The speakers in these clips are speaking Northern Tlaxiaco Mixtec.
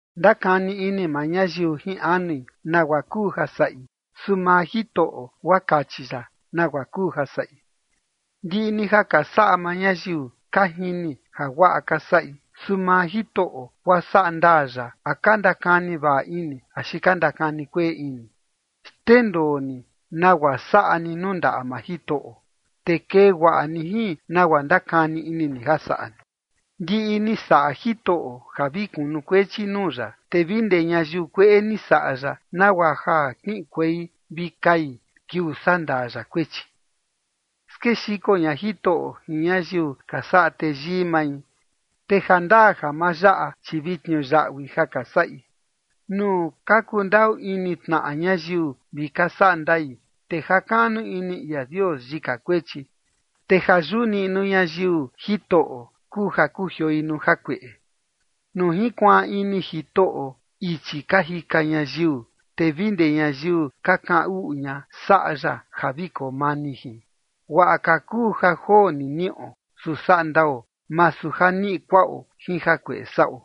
Ndakani ini maa ñayiu jin anui nagua kuu ja saꞌi. Su maa Jitoꞌo guaa kachi ya nagua kuu ja saꞌi. Ndiꞌi ni ja ka saꞌa maa ñayiu, ka jini ja guaꞌa ka saꞌi. Su maa Jitoꞌo guaa sandaa ya a ka ndakani vaꞌa ini axi ka ndakani kueꞌe ini. Xndendoo ni nagua saꞌa ni nuu ndaꞌa maa Jitoꞌo, te kee guaꞌa ni jin nagua ndakani ini ni ja saꞌa ni. Ndiꞌi ni saꞌa Jitoꞌo ja vi kunukuechi nuu ya, te vi ndee ñayiu kueꞌe ni saꞌa ya nagua ja kiꞌinkuei vi kai kiuu sandaa ya kuechi. Skexiko ña Jitoꞌo jin ñayiu ka saꞌa teyii mai, te jandaa ja ma yaꞌa, chi vi tniuyaꞌui ja ka saꞌi. Nuu ka kundaꞌu ini tnaꞌa ñayiu vi ka saꞌa ndai, te jakaꞌnu ini ia Dios yika kuechi, te ja yuꞌu niꞌnu ñayiu Jitoꞌo, kuu ja kujioi nuu jakueꞌe. Nuu jinkuaan ini Jitoꞌo ichi ka jika ñayiu, te vi ndee ñayiu ka kaꞌan uꞌu ña saꞌa ya ja vi koo mani jin. Guaꞌa ka kuu ja joo ni niꞌo, su saꞌa ndao, masu ja niꞌi kuaꞌo jin jakueꞌe saꞌo.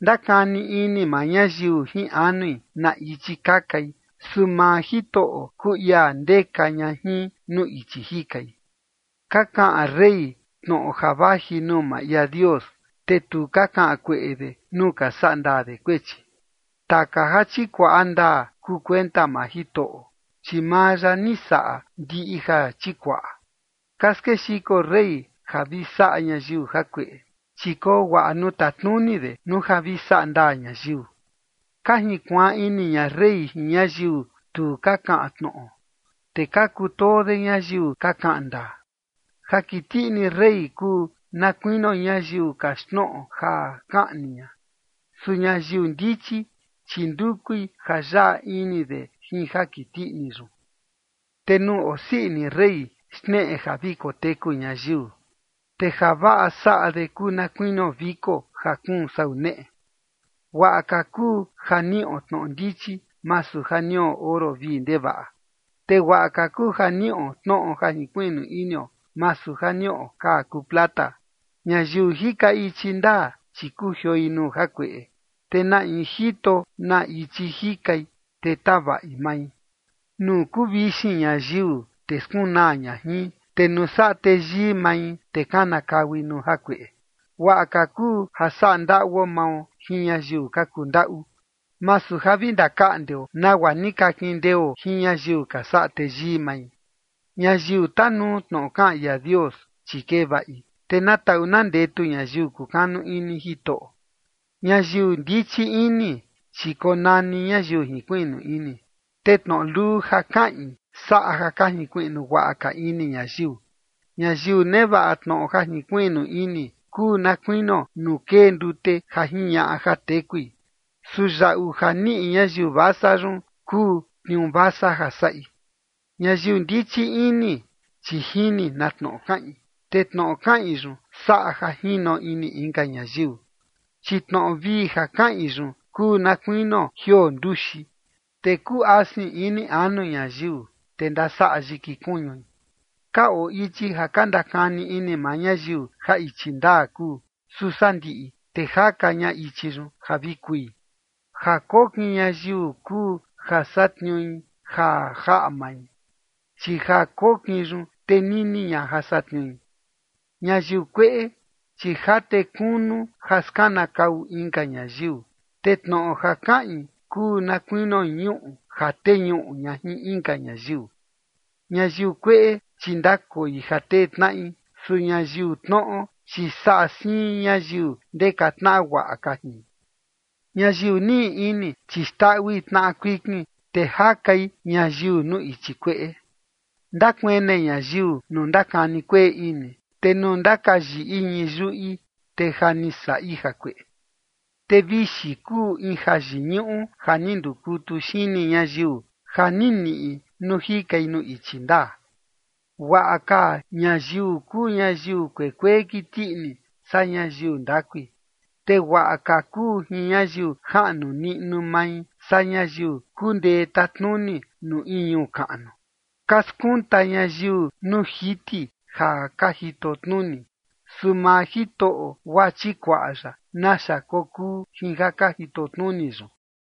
Ndakani ini maa ñayiu jin anui na ichi kakai. Su maa Jitoꞌo kuu ia ndeka ña jin nuu ichi jikai. Ka kaꞌan rey tnoꞌo ja vaji nuu maa ia Dios, te tu ka kaꞌan kueꞌe de nuu ka sandaa de kuechi. Taka ja chikuaꞌa ndaa kuu kuenta maa Jitoꞌo, chi maa ya ni saꞌa ndiꞌi ja chikuaꞌa. Ka skexiko rey ja vi saꞌa ñayiu jakueꞌe, chi koo guaꞌa nuu tatnuni de nuu ja vi saꞌa ndaa ñayiu. Ka junkuaan ini ña rey jin ñayiu tu ka kaꞌan tnoꞌo, te ka kutoo de ñayiu ka kaꞌan ndaa. Ja kiti ini rey kuu na kuinio ñayiu kaxtnoꞌo ja kaꞌni ña. Su ñayiu ndichi, chi ndukui ja yaꞌa ini de jin ja kiti ini yun. Te nuu osii ini rey xneꞌe ja vi koteku ñayiu, te javaꞌa saꞌa de kuu na kuinio viko ja kuun sau neꞌe. Guaꞌa ka kuu ja niꞌo tnoꞌo ndichi, masu ja niꞌo oro vii ndevaꞌa. Te guaꞌa ka kuu ja niꞌo tnoꞌo ja jinkuiꞌnu inio, masu ja niꞌo kaa kuu plata. Ñayiu jika ichi ndaa, chi kujioi nuu jakueꞌe. Te na in jito na ichi jikai, te tavaꞌi mai. Nuu kuu vixin ñayiu, te skunaa ña jin. Te nuu saꞌa teyii mai, te kanakaui nuu jakueꞌe. Guaꞌa ka kuu ja saꞌa ndaꞌuo mao jin ñayiu ka kuu ndaꞌu, masu ja vi ndakaꞌndeo nagua ni ka kindeo jin ñayiu ka saꞌa teyii mai. Ñayiu tanuu tnoꞌo kaꞌan ia Dios, chi kee vaꞌi. Te na taꞌu na ndetu ñayiu kukanu ini Jitoꞌo. Ñayiu ndichi ini, chi konani ñayiu jinkuiꞌnu ini, te tnoꞌo luu ja kaꞌin saꞌa ja ka jinkuiꞌnu guaꞌa ka ini ñayiu. Ñayiu nevaꞌa tnoꞌo ja jinkuiꞌnu ini kuu na kuinio nuu kee ndute ja jiñaꞌa ja tekui. Su yaꞌu ja niꞌi ñayiu vasa yun kuu tniuu vasa ja saꞌi. Ñayiu ndichi ini, chi jini na tnoꞌo kaꞌin, te tnoꞌo kaꞌin yun saꞌa ja jino ini inka ñayiu. Chi tnoꞌo vii ja kaꞌin yun kuu na kuinio jioo nduxi, te kuu asin ini anu ñayiu, te ndasaꞌa yiki kuñui. Ka oo ichi ja ka ndakani ini maa ñayiu ja ichi ndaa kuu, su sandiꞌi, te jaka ña ichi yun ja vi kui. Ja kokin ñayiu kuu ja satniui ja jaꞌa mai, chi ja kokin yun tenini ña ja satniui. Ñayiu kueꞌe, chi jate kunu ja skanakau inka ñayiu, te tnoꞌo ja kaꞌin kuu na kuinio ñuꞌu ja teñuꞌu ña jin inka ñayiu. Ñayiu kueꞌe, chi ndakoi ja tetnaꞌi, te ñayiu tnoꞌo, chi saꞌa siin ñayiu ndeka tnaꞌa guaꞌa ka jin. Ñayiu niꞌi ini, chi xndaꞌui tnaꞌa kuikin, te jakai ñayiu nuu ichi kueꞌe. Ndakuene ñayiu nuu ndakani kueꞌe ini, te nuu ndakayiꞌi ñii yuꞌi, te ja ni saꞌi jakueꞌe. Te vixi kuu in jayiñuꞌu ja ni ndukutu xini ñayiu, ja ni niꞌi nuu jikai nuu ichi ndaa. Guaꞌa ka ñayiu kuu ñayiu kuekuee kiti ini, saa ñayiu ndakui. Te guaꞌa ka kuu jin ñayiu jaꞌnu niꞌnu mai saa ñayiu kundee tatnuni nuu in ñuu kaꞌnu. Ka skunta ñayiu nuu jiti ja ka jitotnuni. Su maa Jitoꞌo guaa chikuaꞌa ya naxa kokuu jin ja ka jitotnuni yun.